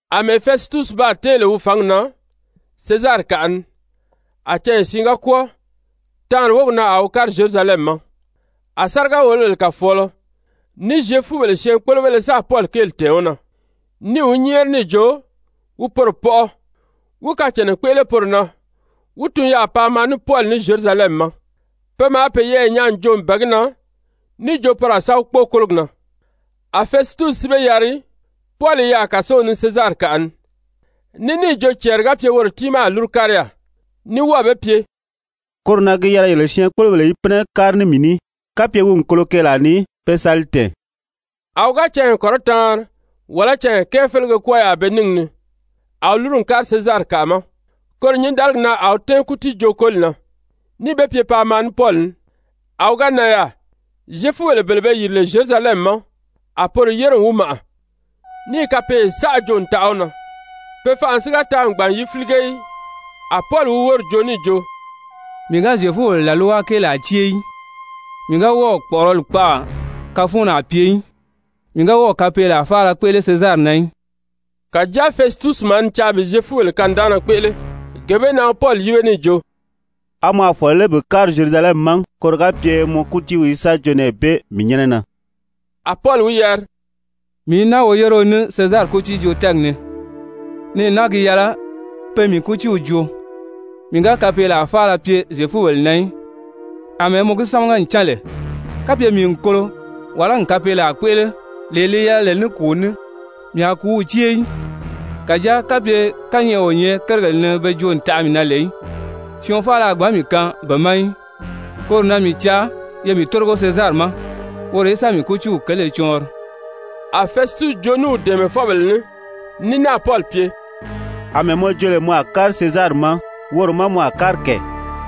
Amɛɛ Fɛsitusi baa tɛ́ɛn lè wi fǎngi na Sezarikaʔa ni, a canya siin ga kwɔ́ɔ, taanri wógi na a wi kári Zyerusalɛmi ma. A sáriga-wòlobèle kàfɔɔlɔ ní Zyefubèle syɛɛnkpolobéle sáà Pɔli kéeli tɛ̀ɛn wi na, níì wi nyɛ́ɛri níì jo wi poro pɔʔɔ wí kacànna kpéʔele poro na wí tun yaà paa maa ní Pɔli ní Zyerusalɛmi ma. Pe maa peyɛɛ nyaa n jo n bɛ̀ɛ gi na níì jo poro a sa wi kpóo kólogi na. A Fɛsitusi si be yari, Pɔli i yaà kàsow ni Sezarikaʔa ni, ní níì jo cɛɛri ga pye woro tiimaa a lúru kári yaà, ní wɔ́ɔ̀ be pye: «Koro na gi yɛlɛ yele syɛɛnkpolobèle í pínɛ kári ní mii ní, kapye wi n kolo keelaa ni, pe sa li tɛ̀ɛn.» A wi ga canya kɔrɔtaanri wàlá canya kɛɛ félege kwɔ́ɔ yaà be níngi ni, a wi lúru n kári Sezarikaʔa ma. Koro nyǐndaligi na a wi tɛ́ɛn kútiijoo-koli na, níì be pye paa maa ní Pɔli ní. A wi ga nan yaà, Zyefubèle bele be yìri lè Zyerusalɛmi ma, a poro yére n wi màʔa, níì kapeeye saʔa joo n taʔa wi na, pe fanʔa si ga taa n gbàn n yi fílige í. A Pɔli wi wóri joo níì jo: «Mii ga Zyefubèle làlwa kéelaa cée í, mii ga wɔ́ɔ̀ kpɔ̀ʔɔrɔli kpaʔa kafuunnaa pye í, mii ga wɔ́ɔ̀ kapeelaa faala kpéʔele Sezari na í.» Kàjáa Fɛsitusi maa ni caa bi Zyefubèle kanidaanna kpéʔele, gee bee na wi Pɔli yíbe níì jo: «A mɔ a fɔ̀lɔ lé bi kári Zyerusalɛmi ma, koro ga pye mɔ kútiiw í sa joo nɛɛ bee mii nyɛ́nɛ na?» A Pɔli wi yari: «Mii i naa woyéreo ní Sezari kútiijoo-tɛ́ɛgi ni, nɛɛ naa gi yɛlɛ pe mii kútiiw joo. Mii ga kapeelaa faala pye Zyefubèle na í, àmɛɛ mɔ gi sámaga n cán lè. Kapye mii n kolo, wàlá n kapeelaa kpéʔele, lee li yɛlɛ lè ní kùu ní, mii a kùúw cée í. Kàjáa kapye kányɛʔɛ o nyɛ kérigèle ni pe joo n taʔa mii na lè í, syɔɔn faala a gbǎn mii kaan be ma í. Koro na mii caa ye mii tórigo Sezari ma woro í sa mii kútiiw kéele cɔɔnri.» A Fɛsitusi joo ní wi dɛ̀ɛmɛfɔbèle ní, ní náà Pɔli pye: «Amɛɛ mɔ jo lè mɔ a kári Sezari ma, woro má mɔ a kári kɛ.»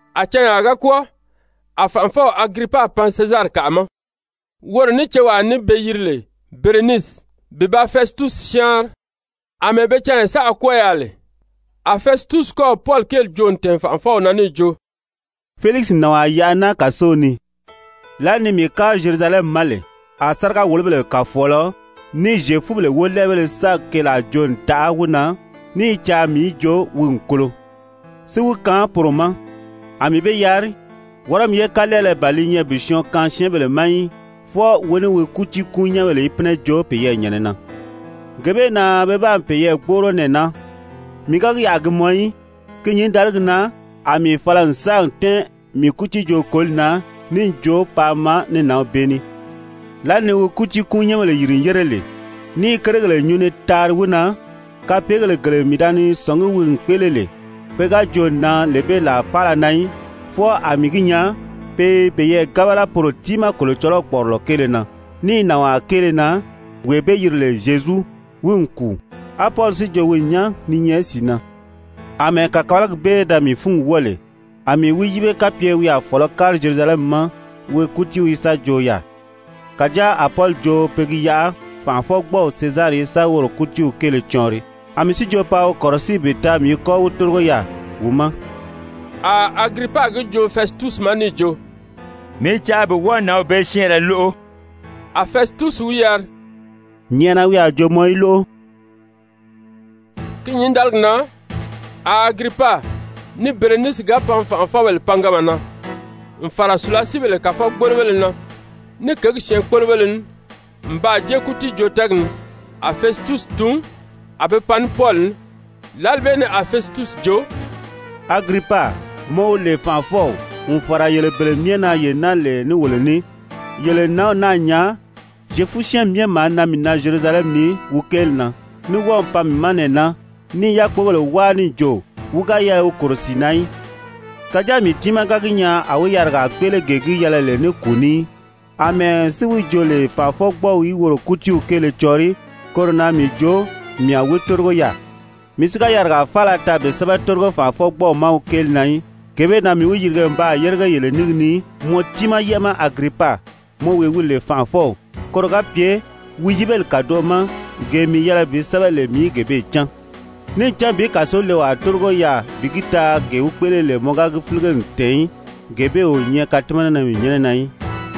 A canyaa ga kwɔ́ɔ, a fànʔafɔw Agiripa pan Sezarikaʔa ma, woro ní cewaa ní be yiri lè Berenisi, bi ba Fɛsitusi syáanri. Amɛɛ be canya saʔa kwɔ́ɔ yaà lè, a Fɛsitusi kɔ́ɔ̀ Pɔli kéeli joo n tɛ̀ɛn fànʔafɔw na níì jo: «Felikisi n nànwaa yaʔa naa kàsow ni. Lǎli ni mii kári Zyerusalɛmi ma lè a sáriga-wòlobèle kàfɔɔlɔ ní Zyefubèle wólɛɛbéle sáà keelaa joo n taʔa wi na, ní i caa mii í jo wi n kolo, si wi kaan poro ma. A mii be yari: ‹Wɔrɔmi ye kalɛɛlɛ ban li nyɛ bi syɔɔn kaan syɛ́ɛnbèle ma í, fwɔɔ wi ní wi kútiikuun-nyɛ́nbèle í pínɛ joo peyɛɛ nyɛ̀nɛ na.› Gee bee na pe baa peyɛɛ gbóʔoro nɛɛ naa. Mii ga gi yaʔa a gi mɔn í, ki nyǐndaligi na a mii fala n sáà tɛ́ɛn mii kútiijoo-koli na níì jo paa maa ní nǎnw bee ní. Lǎli ni wi kútiikuun-nyɛ́nbèle yìri n yére lè, ní i kérigèle nyuu ni taari wi na, kapeegèle gele mii da ni sɔ̀ngí wi n kpéʔele lè, pe ga joo n nan lee bee làa faala na í, fwɔɔ a mii gi nyaa pe i peyɛɛ gábala poro tiimaa Kolocɔlɔw kpɔ̀ʔɔrɔlɔ kéele na, ní nànwaa kéele na, wee be yiri lè Zyezu, wi n kùu, á Pɔli si jo wi n nyán ni nyɛ sìi na. Amɛɛ kàkabalagi bee da mii fúngi wɔ́ɔ lè, a mii wi yíbe kapye wi a fɔ̀lɔ́ kári Zyerusalɛmi ma wi kútiiw í sa joo yaà. Kàjáa a Pɔli jo pe gi yaʔa fànʔafɔgbɔɔw Sezari í sa woro kútiiw kéele cɔɔnri. A mii si jo paa wi kɔ̀rɔsíi bi taa mii í kɔ́ wi tórigo yaà wi ma.» A Agiripa gi joo Fɛsitusi ma níì jo: «Mii i caa bi wɔ́ɔ nǎnw bee syɛ́ɛnrɛ lóʔo.» A Fɛsitusi wi yari: «Nyɛ̀ʔɛna wi a joo mɔ í lóʔo.» Ki nyǐndaligi na a Agiripa ní Berenisi ga pan fànʔafɔbèle panganma na, n fàra sùlasiibèle kàfɔgbolobéle na ní kěgi syɛɛnkpolobéle ní, n baa jée kútiijoo-tɛ́ɛgi ni, a Fɛsitusi tun a be pan ní Pɔli ní. Lǎli bee ni a Fɛsitusi jo: «Agiripa, mɔ wee wi lè fànʔafɔw, n fàra yele bele myɛ na ye naa lè ní wolo ní, yele n nǎnw naa nyaa, Zyefu-syɛ́ɛnmi myɛ maa nan mii na Zyerusalɛmi ni wi kéeli na, ní wɔ́ɔ̀ pan mii ma nɛɛ naa, ní i yákpogèle wáa níì jo, wi ga yɛlɛ wi kòro sìi na í. Kàjáa mii tiimaa ga gi nyaa a wi yarigaa kpéʔele gee gi yɛlɛ lè ní kùu ní í. Amɛɛ si wi jo lè fànʔafɔgbɔɔw í woro kútiiw kéele cɔɔnri, koro na mii jo mii a wi tórigo yaà. Mii si ga yarigaa faala taa bi sɛ́bɛ tórigo fànʔafɔgbɔɔw ma wi kéeli na í. Gee bee na mii wi yirige n baa yérige yele níngi ni, mɔ tiimaa yɛ́ʔɛ ma Agiripa, mɔ wee wi lè fànʔafɔw, koro ga pye wi yíbeli kàdoʔo ma gee mii yɛlɛ bi sɛ́bɛ lè mii í gee bee cán. Níì cán bi kàsolewaa tórigo yaà bi gi taa gee wi kpéʔele lè mɔ ga gi fílige n tɛ̀ɛn í, gee bee o nyɛ katimanana mii nyɛ́nɛ na í.»